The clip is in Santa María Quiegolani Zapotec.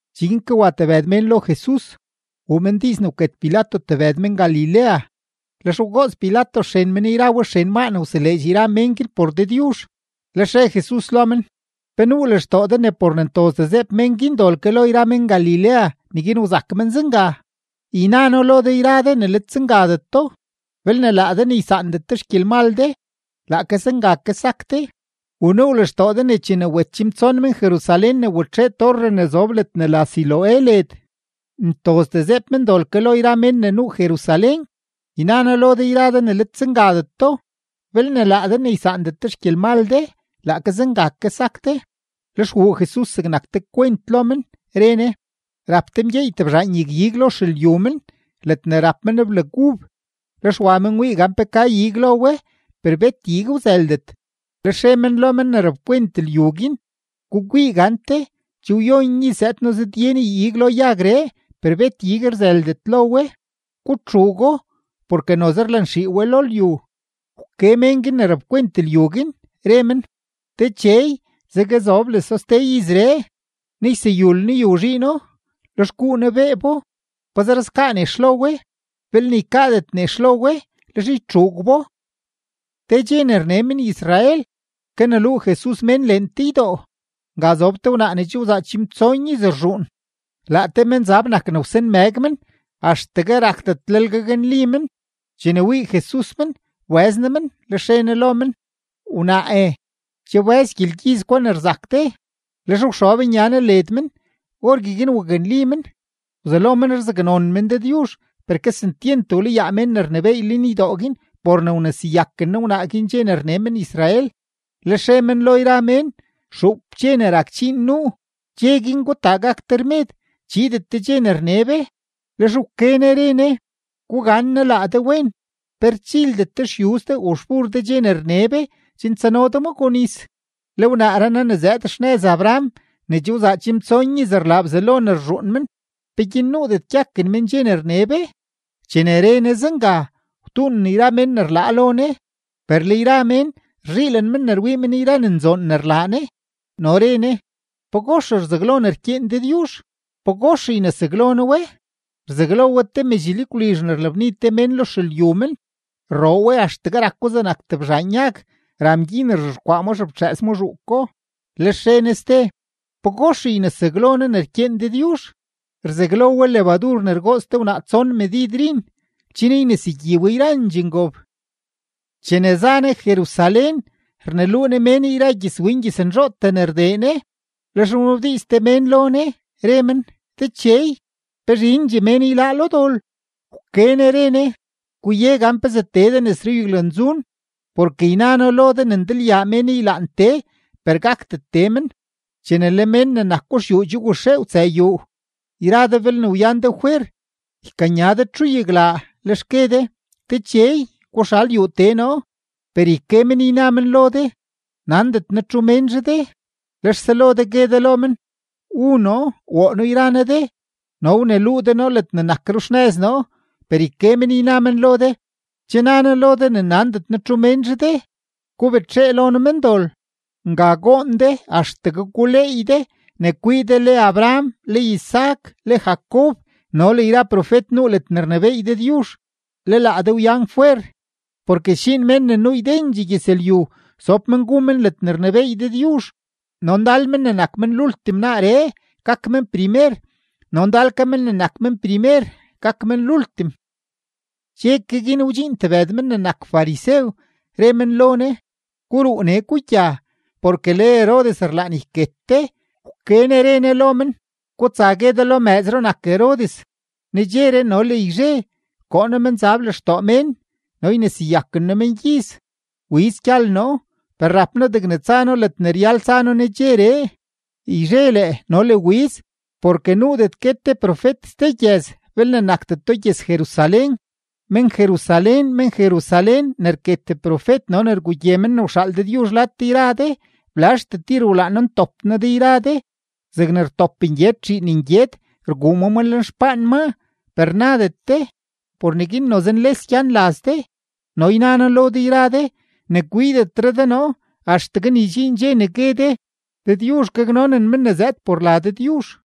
Cheguin ke wa tebëd mén lo Jesus, wuu men diiz ne wket Pilato tebëd men-Galilea. Lex wgoots Pilato xren men yra we xren maa ne wseleedx yra mén guin por Dëdyuzh. Lex re Jesus lo men: ―¿Pe nuu lextoo de ne por ne ntozdee zeeb mén guin dol ke lo yra men-Galilea, neguin wzak men zenga? Yna noo lo de yra de ne let zengadeto. Belne laa de ne ysaandet de xgyelmal de, laake zenga ke sak de. ¿U nuu lextoo de ne chene wet chimtson men-Jerusalén ne watxee torre ne zob ledne la Siloé led, ntozdee zeeb men dol ke lo yra men ne nuu Jerusalén? Yna noo lo de yra de ne let zengadeto. Belne laa de ne ysaandet de xgyelmal de, laake zenga ke sak de. Lex wuu Jesus zegnak te kwent lo men, re Ne: ―Rap te mgyeey tebzhaan yag-ig lo xelyu men ledne rap men blag ub, lex wa men wii gan pe ka ig lo we, per bet ig wzëldet. Lex re men lo men ne rapkwent lyu guin: “Gukwii gante, che wyon iz zëëd noo zëdye noo ig lo yagree, per bet ig rzëldet lo we. Gutxuugo, porke noze rlanxii we lo lyu.” Wke mén guin ne rapkwent lyu guin, re men: “Dechey, zeguezobleso ste izree, ne yseyul noo yu zhiino, lex guu noo beebo. Pazer skaa nex lo we. Belne ykaadet nex lo we, lex ytxuug bo.” Te dxe ne rne men-Israel, kaneluu Jesus mén leen te ydoo. Nga zob te wnaa ne che wzaa chimtson iz rzhuun. Laa te menzab nak ne wsanmëg men, axtegue rakdetlel gaknli men. Chene wii Jesus men, wbëz Ne men, lex re Ne lo men: ―Wnaae, che wbëz gyelgyiz gwa ne rzak de. Lex wxob nya Ne led men; orgueguin waknli men. Wzelo men rzaknon men Dëdyuzh. Per kesentyent wlayaa mén ne rnebééy lenydoo guin por ne wneseyaken Ne wnaa guin dxe ne rne men-Israel, lex re men lo yra mén: ―Xuup dxe ne rak dxiin nuu; dxe guin gutaa gak de rmed, chiidet de dxe ne rne be. Lex wke Ne re Ne: ―¡Gugannaa laa de wen! ¿Pe rchildet de xyuz de u xbur de dxe ne rne be chen tsano de ma gonis? Le wnaaree naa ne zëëd xnëz Abraham ne che wzaa chimtson iz rlaa Bzelo ne rzhuun men, ¿peguin nuudet gyaken men dxe ne rne be? Chene re Ne zenga, wtuunen yra mén ne rlaa lo Ne. Per le yra mén rzhiilen men ne rwii men yra ne nzoon ne rlaa Ne. No re Jesus: ―¿Pagox rzaglo ne rkyeen Dëdyuzh? ¿Pagox ynesaglo noo we? Rzaglo we te medx lyagwlizh ne rlabni te mén lo xelyu men. Rroo we axtegue rako zegnak tebzhaan yag, ra mgyin rzhexkwaa ma xeftxëës ma zhuuko. Lex re Jesus ste: ―¿Pagox ynesaglo noo ne rkyeen Dëdyuzh? Rzaglo we lebadur ne rgoots te wnaa tson medid rin chen ynesegyi we yrandxee ngob. Chene za Jesus Jerusalén, rneluu Ne mén yra gyëzwin gyëznzhootee ne rdee Ne. Lex wnabdiiz te mén lo Ne, re men: ―Dechey, ¿pe zhindxee mén yláá lo dol? Wke Ne re Ne: ―Guye gan pezee tee de nes ruyaglanzun; porke yna noo lo de ne ndalyaa mén ylaan tee, per gakdet tee men. Chene le mén ne nako xyuu che waxee wtsëë yuu, yra de belne wyan de fwer, ykanya de txuyaglaa; lex gue de: “Dechey, guxal yuu tee noo.” Per yke men, yna men lo de: “Nandet noo txu ménzhe de.” Lex selo de gue de lo men: “Wu noo, woo noo yra noo de, no wneluu de noo ledne nak ruxnëz noo.” Per yke men, yna men lo de: “Che na noo lo de ne nandet noo txu ménzhe de. Gubetxee lo noo, mendol.” Nga goon de axtegue guleey de ne kwii de le Abraham, le Isaac, le Jacob, no le yra profet nuu ledne rnebééy Dëdyuzh, le laa de wyan fwer. Porke sdxiin mén ne nuu ydendxee gyëzlyu sob men gu men ledne rnebééy Dëdyuzh. No ndal men ne nak men lultim naaree, gak men primer; no ndal ke men ne nak men primer, gak men lultim. Dxe ke guin wdxiin tebëd men ne nak farisew, re men lo Jesus: ―Guruu nee, gugya, porke le Herodes rlaan yket de. Wke Ne re Ne lo men: ―Gutsa gue de lo mëëzro nak Herodes: “Nedxeree no le yzhe koo noo menzab lextoo mén no yneseyaken noo mengyiz; wiz gyal noo.” Per rap noo degne tsa noo ledne ryal tsa noo nedxeree, yzhe lee no le wiz, porke nuudet guet te profet ste gyëz belne nakdeto gyëz-Jerusalén. ’¡Men-Jerusalén, men-Jerusalén, ne rket profet no ne rgugye men ne wxaal Dëdyuzh lad de yra de! ¡Blazhtee tir wlaan noo ntop noo de yra de zegne rtop ngyed zhiin ngyed rguu ma ma lenxpaan maa, per nadet de! Por neguin noze nles gyan laz de; no yna noo lo de yra de, ne kwiidetre de noo axtegue ne ydxiin dxe ne gue de: “¡Dëdyuzh gaknonen men ne zëëd por la Dëdyuzh!”